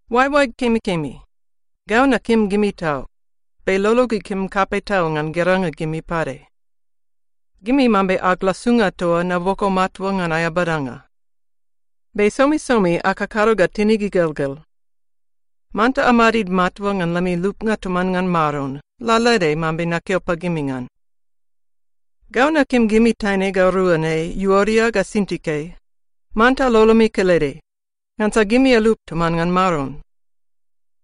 Oaeoaeg kemikemi, gau nakim gimi tau, be lolog ikim kapei tau ngan geranga gimi pade. Gimi mambe ag lasunga toa naboko matua ngan aea badanga. Be somisomi akakado ga tinig igelgel. Manta amadid matua ngan lemi lupnga toman ngan Maron, lalaede mambe nakeo pagimi ngan. Gau nakim gimi taine ga rua ne Iuodia ga Sintike, manta lolomi kelede, ngansa gimi alup toman ngan Maron.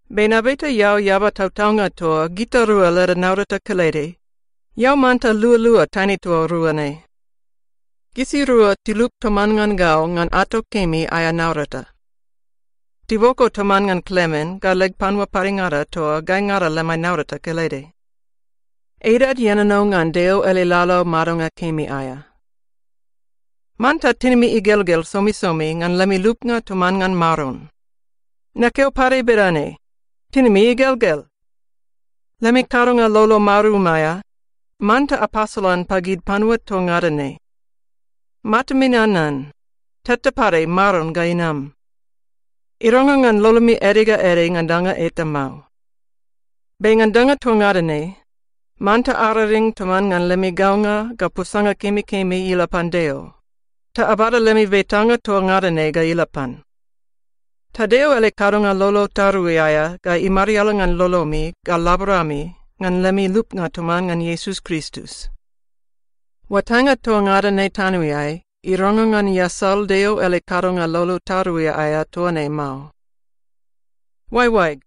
Be nabeta eao eaba tautaunga toa gitarua leda naurata kelede, eao manta lualua taine toa rua ne. Gisirua tilup toman ngan gau ngan ato kemi aea naurata. Tiboko toman ngan Klemen ga leg panua padengada toa gaingada lemai naurata kelede. Edad ienono ngan Deo ele laulau madonga kemi aea. Manta tinimi igelgel somisomi ngan lemi lupnga toman ngan Maron. Nakeo pade bedane: Tinimi igelgel! Lemi kadonga lolo marum aea, manta apasolan pagid panua toa ngada ne. Matami nanan, teta pade Maron ga inam. Irangrang ngan lolomi ede ga ede ngan danga eta mao. Be ngan danga toa ngada ne, manta araring toman ngan lemi gaunga ga posanga kemikemi ila pan Deo, ta abada lemi betanga toa ngada ne ga ila pan. Ta Deo ele kadonga lolo tarui aea ga imariala ngan lolomi ga laborami ngan lemi lupnga toman ngan Iesus Kristus. Oatainga toa ngada ne tanoeai irangrang ngan iasal Deo ele kadonga lolo tarui aea toa ne mao. Oaeoaeg,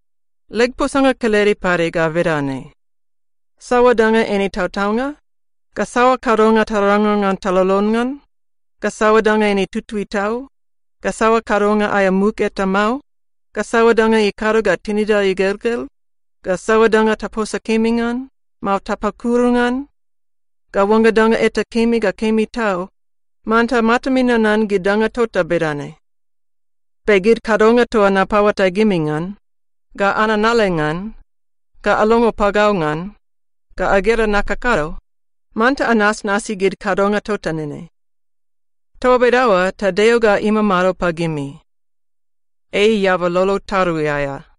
leg posanga kelede pade ga bedane: Saoa danga eine tautaunga, ga saoa kadonga tarangrang ngan talolon ngan, ga saoa danga eine tutui tau, ga saoa kadonga aea muk eta mao, ga saoa danga ikado ga tinida igelgel, ga saoa danga taposa kemi ngan, mao tapakuru ngan, ga oangga danga eta kemi ga kemi tau, manta matami nanan gid danga tota bedane. Be gid kadonga toa napaoatai gimi ngan, ga ananale ngan, ga alongo pagau ngan, ga agera nakakado, manta anasnasi gid kadonga tota nene. Toa bedaoa ta Deo ga imamado pagimi. Ei eaba lolo tarui aea.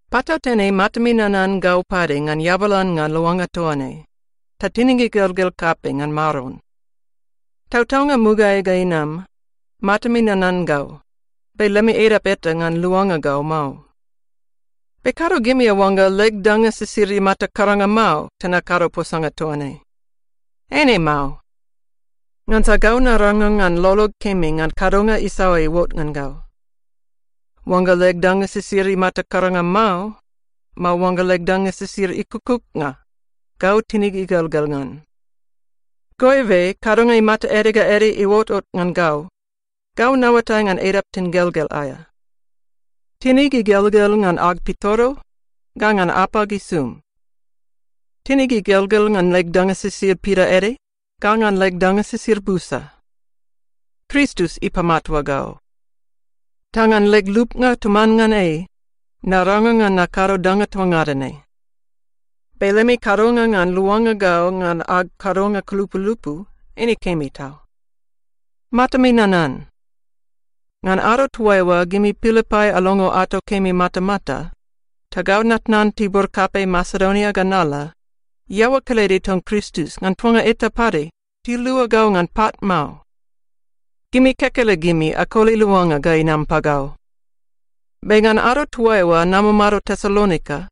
Patautene matami nanan gau pade ngan eabalannga luanga toa ne, ta tinig igelgel kapei ngan Maron. Tautaunga mugaeai ga inam, matami nanan gau, be lemi edap eta ngan luanga gau mao. Be kado gimi aoangga leg danga sisid imata karanga mao ta nakado posanga toa ne. Eine mao. Ngansa gau narangrang ngan lolog kemi ngan kadonga isaoa iuot ngan gau. Oangga leg danga sisid imata karanga mao, mao oangga leg danga sisid ikukuknga, gau tinig igelgel ngan. Goibe kadonga imata ede ga ede iuotot ngan gau, gau naoatai ngan edap tingelgel aea. Tinig igelgel ngan ag pitoro, ga ngan apag isum. Tinig igelgel ngan leg danga sisid pidaede, ga ngan leg danga sisid busa. Kristus ipamatua gau. Ta ngan leg lupnga toman ngan ei, narangrang ngan nakado danga toa ngada ne. Be lemi kadonga ngan luanga gau ngan ag kadonga kulupulupu, eine kemi tau. Matami nanan. Ngan ado toaiua gimi Pilipai alongo ato kemi matamata, ta gau natnan tibur kapei Masedonia ga nala, iaoa kelede ton Kristus ngan tuanga eta pade tilua gau ngan pat mao. Gimi kekelegimi akoli luanga ga inam pagau. Be ngan ado toaiua namamado Tesalonika,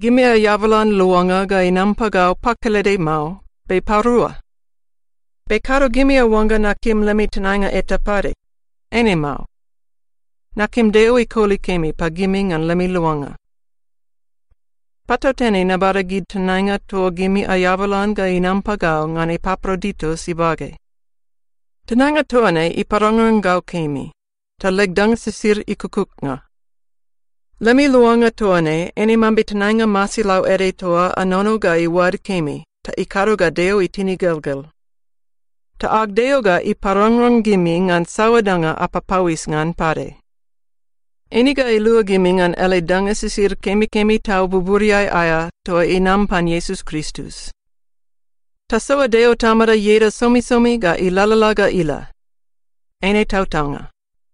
gimi aeabalan luanga ga inam pagau pakelede mao, be parua. Be kado gimi aoangga nakim lemi tenainga eta pade. Eine mao. Nakim Deo ikoli kemi pagimi ngan lemi luanga. Patautene nabada gid tenainga toa gimi aeabalan ga inam pagau ngan Epaproditus ibage. Tenainga toa ne iparangrang gau kemi, ta leg danga sisid ikukuknga. Lemi luanga toa ne eine mambe tenainga masilau ede toa anono ga iuad kemi ta ikado ga Deo itin igelgel. Ta ag Deo ga iparangrang gimi ngan saoa danga apapauis ngan pade. Eine ga ilua gimi ngan ele danga sisid kemikemi tau buburiai aea toa inam pan Iesus Kristus. Tasoa Deo Tamada ieda somisomi ga ilalala ga ila. Eine tautaunga.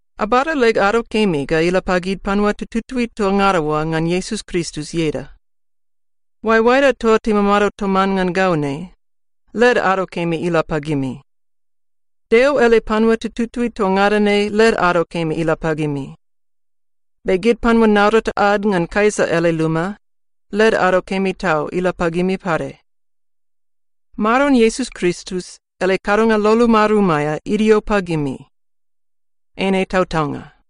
Abada leg ado kemi ga ila pagid panua tututui toa ngada oa ngan Iesus Kristus ieda. Oaeoaeda toa timamado toman ngan gau ne, led ado kemi ila pagimi. Deo ele panua tututui toa ngada ne led ado kemi ila pagimi. Be gid panua naurata ad ngan Kaisa ele luma, led ado kemi tau ila pagimi pade. Maron Iesus Kristus ele kadonga lolo marum aea idio pagimi. Eine tautaunga.